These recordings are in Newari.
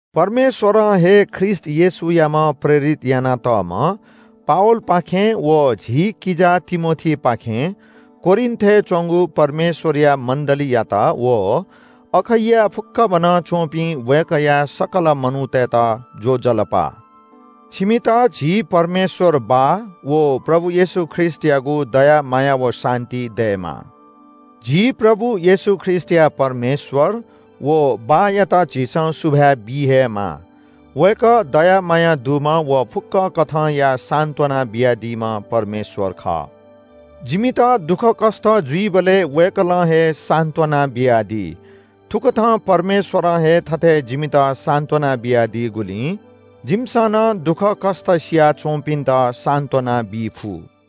परमेश्‍वरं हे ख्रीष्‍ट येशूयाम्‍ह प्रेरित यानातःम्‍ह पावलपाखें व झी किजा तिमोथीपाखें कोरिन्‍थय् च्‍वंगु परमेश्‍वरया मण्‍डलीयात व अखैयाय् फुक्‍कभनं च्‍वंपिं वय्‌कःया सकल मनूतय्‌त ज्‍वजलपा। छिमित झी परमेश्‍वर बाः व प्रभु येशू ख्रीष्‍टयागु दया माया व शान्‍ति दयेमा। झी प्रभु येशू ख्रीष्‍टया परमेश्‍वर व बाःयात झीसं सुभाय् बी हे माः। वय्‌कः दया माया दुम्‍ह व फुक्‍क कथंया सान्‍त्‍वना बियादीम्‍ह परमेश्‍वर खः। जिमित दुःखकष्‍ट जुइबलय् वय्‌कलं हे सान्‍त्‍वना बियादी। थुकथं परमेश्‍वरं हे थथे जिमित सान्‍त्‍वना बियादीगुलिं जिमिसं नं दुःखकष्‍ट सियाच्‍वंपिन्‍त सान्‍त्‍वना बी फु।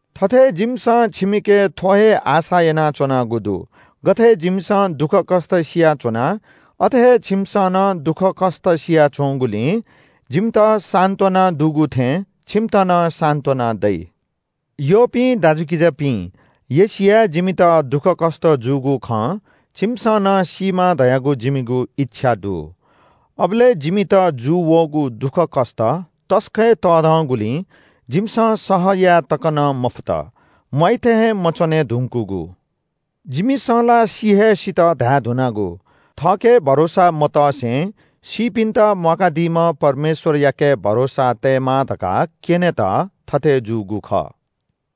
थथे जिमिसं छिमिके थ्‍व हे आशा यानाच्‍वनागु दु। गथे जिमिसं दुःखकष्‍ट सियाच्‍वना अथे हे छिमिसं नं दुःखकष्‍ट सियाच्‍वंगुलिं जिमित सान्‍त्‍वना दुगु थें छिमित नं सान्‍त्‍वना दइ। यःपिं दाजुकिजापिं, एशियाय् जिमित दुःखकष्‍ट जूगु खँ छिमिसं नं सीमा धयागु जिमिगु इच्‍छा दु। अबलय् जिमित जूवःगु दुःखकष्‍ट तसकं हे तःधंगुलिं जिमिसं सह याये तक नं मफुत। म्‍वाइ थें हे मच्‍वने धुंकूगु। जिमिसं ला “सि हे सित” धाये धुनागु। थःके भरोसा मतसे सीपिन्‍त म्‍वाकादीम्‍ह परमेश्‍वरयाके भरोसा तयेमा धकाः क्‍यनेत थथे जूगु खः।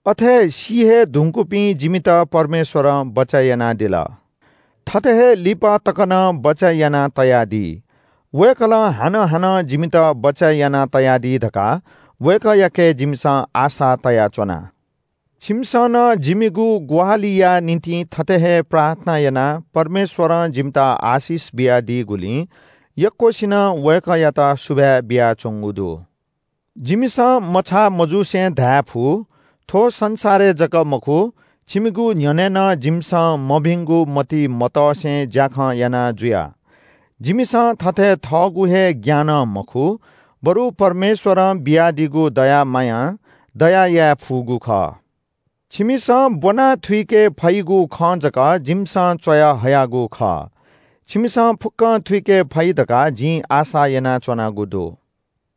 अथे सी हे धुंकूपिं जिमित परमेश्‍वरं बचय् यानादिल, थथे हे लिपा तक नं बचय् यानातयादी। वय्‌कलं हानं हानं जिमित बचय् यानातयादी धकाः वय्‌कःयाके जिमिसं आशा तयाच्‍वना। छिमिसं नं जिमिगु ग्‍वाहालिया निंतिं थथे हे प्रार्थना यानाः परमेश्‍वरं जिमित आशिष बियादीगुलिं यक्‍वसिनं वय्‌कःयात सुभाय् बियाच्‍वंगु दु। जिमिसं मछाः मजुसे धायेफु – थ्‍व संसारय् जक मखु छिमिगु न्‍ह्यःने नं जिमिसं मभिंगु मतिइ मतसे ज्‍याखँ याना जुया। जिमिसं थथे थःगु हे ज्ञानं मखु, बरु परमेश्‍वरं बियादीगु दया मायां दया याये फुगु खः। छिमिसं ब्‍वनाः थुइके फइगु खँ जक जिमिसं च्‍वयाहयागु खः। छिमिसं फुक्‍कं थुइके फइ धकाः जिं आशा यानाच्‍वनागु दु।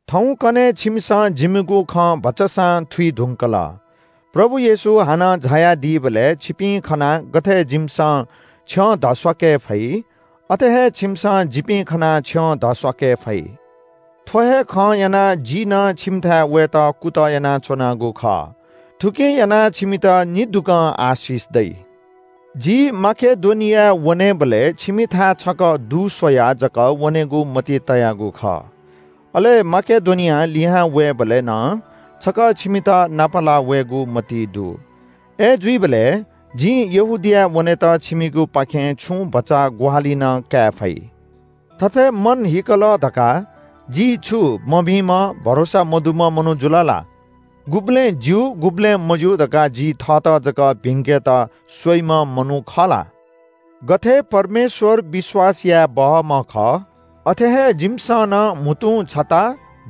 थौंकन्‍हय् छिमिसं जिमिगु खँ भचासां थुइ धुंकल। प्रभु येशू हानं झायादीबलय् छिपिं खनाः गथे जिमिसं छ्यं धस्‍वाके फइ अथे हे छिमिसं जिपिं खनाः छ्यं धस्‍वाके फइ। थ्‍व हे खं यानाः जि नं छिमिथाय् वयेत कुतः यानाच्‍वनागु खः। थुकिं यानाः छिमित निदुगं आशिष दइ। जि माकेडोनियाय् वनेबलय् छिमिथाय् छकः दुस्‍वयाः जक वनेगु मतिइ तयागु खः। अले माकेडोनियां लिहां वयेबलय् नं छकः छिमित नापलाः वयेगु मतिइ दु। अय्‌जुइबलय् जिं यहूदियाय् वनेत छिमिगुपाखें छुं भचा ग्‍वाहालि नं काये फइ। थथे मन हीकल धकाः जि छु मभिंम्‍ह, भरोसा मदुम्‍ह मनू जुल ला? गुबलें “ज्‍यू,” गुबलें “मज्‍यू” धकाः जि थःत जक भिंकेत स्‍वइम्‍ह मनू खः ला? गथे परमेश्‍वर विश्‍वास याये बहःम्‍ह खः, अथे हे जिमिसं नं म्‍हुतुं छता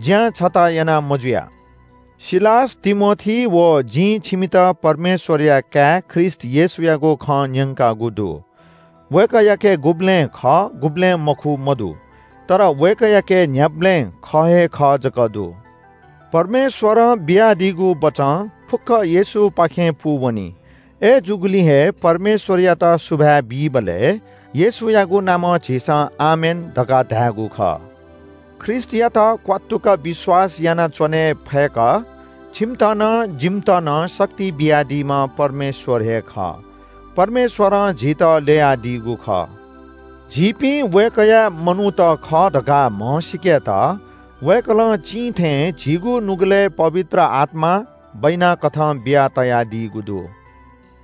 ज्‍यां छता याना मजुया। सिलास, तिमोथी व जिं छिमित परमेश्‍वरया काय् ख्रीष्‍ट येशूयागु खँ न्‍यंकागु दु। वय्‌कःयाके गुबलें “खः” गुबलें “मखु” मदु। तर वय्‌कःयाके न्‍ह्याबलें “खः हे खः” जक दु। परमेश्‍वरं बियादीगु बचं फुक्‍क येशूपाखें पूवनी। अय्‌जूगुलिं हे परमेश्‍वरयात सुभाय् बीबलय् येशूयागु नामं झीसं “आमेन” धकाः धायेगु खः। ख्रीष्‍टयात क्‍वात्तुक विश्‍वास यानाच्‍वने फय्‌क छिमित नं जिमित नं शक्ति बियादीम्‍ह परमेश्‍वर हे खः। परमेश्‍वरं झीत ल्‍ययादीगु खः। झीपिं वय्‌कःया मनूत खः धकाः म्‍हसीकेत वय्‌कलं चिं थें झीगु नुगलय् पवित्र आत्‍मा बैनाकथं बियातयादीगु दु।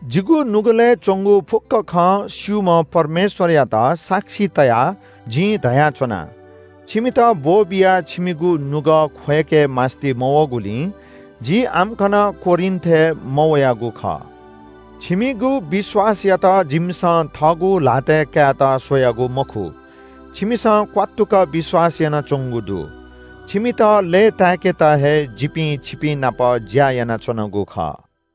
जिगु नुगलय् च्‍वंगु फुक्‍क खँ स्‍यूम्‍ह परमेश्‍वरयात साक्षी तयाः जिं धयाच्‍वना। छिमित ब्‍वःबियाः छिमिगु नुगः ख्‍वय्‌के मास्‍ति मवःगुलिं जि आम्‍कन कोरिन्‍थय् मवयागु खः। छिमिगु विश्‍वासयात जिमिसं थःगु ल्‍हातय् कायेत स्‍वयागु मखु। छिमिसं क्‍वात्तुक विश्‍वास यानाच्‍वंगु दु। छिमित लय्‌ताय्‌केत हे जिपिं छिपिंनाप ज्‍या यानाच्‍वनागु खः।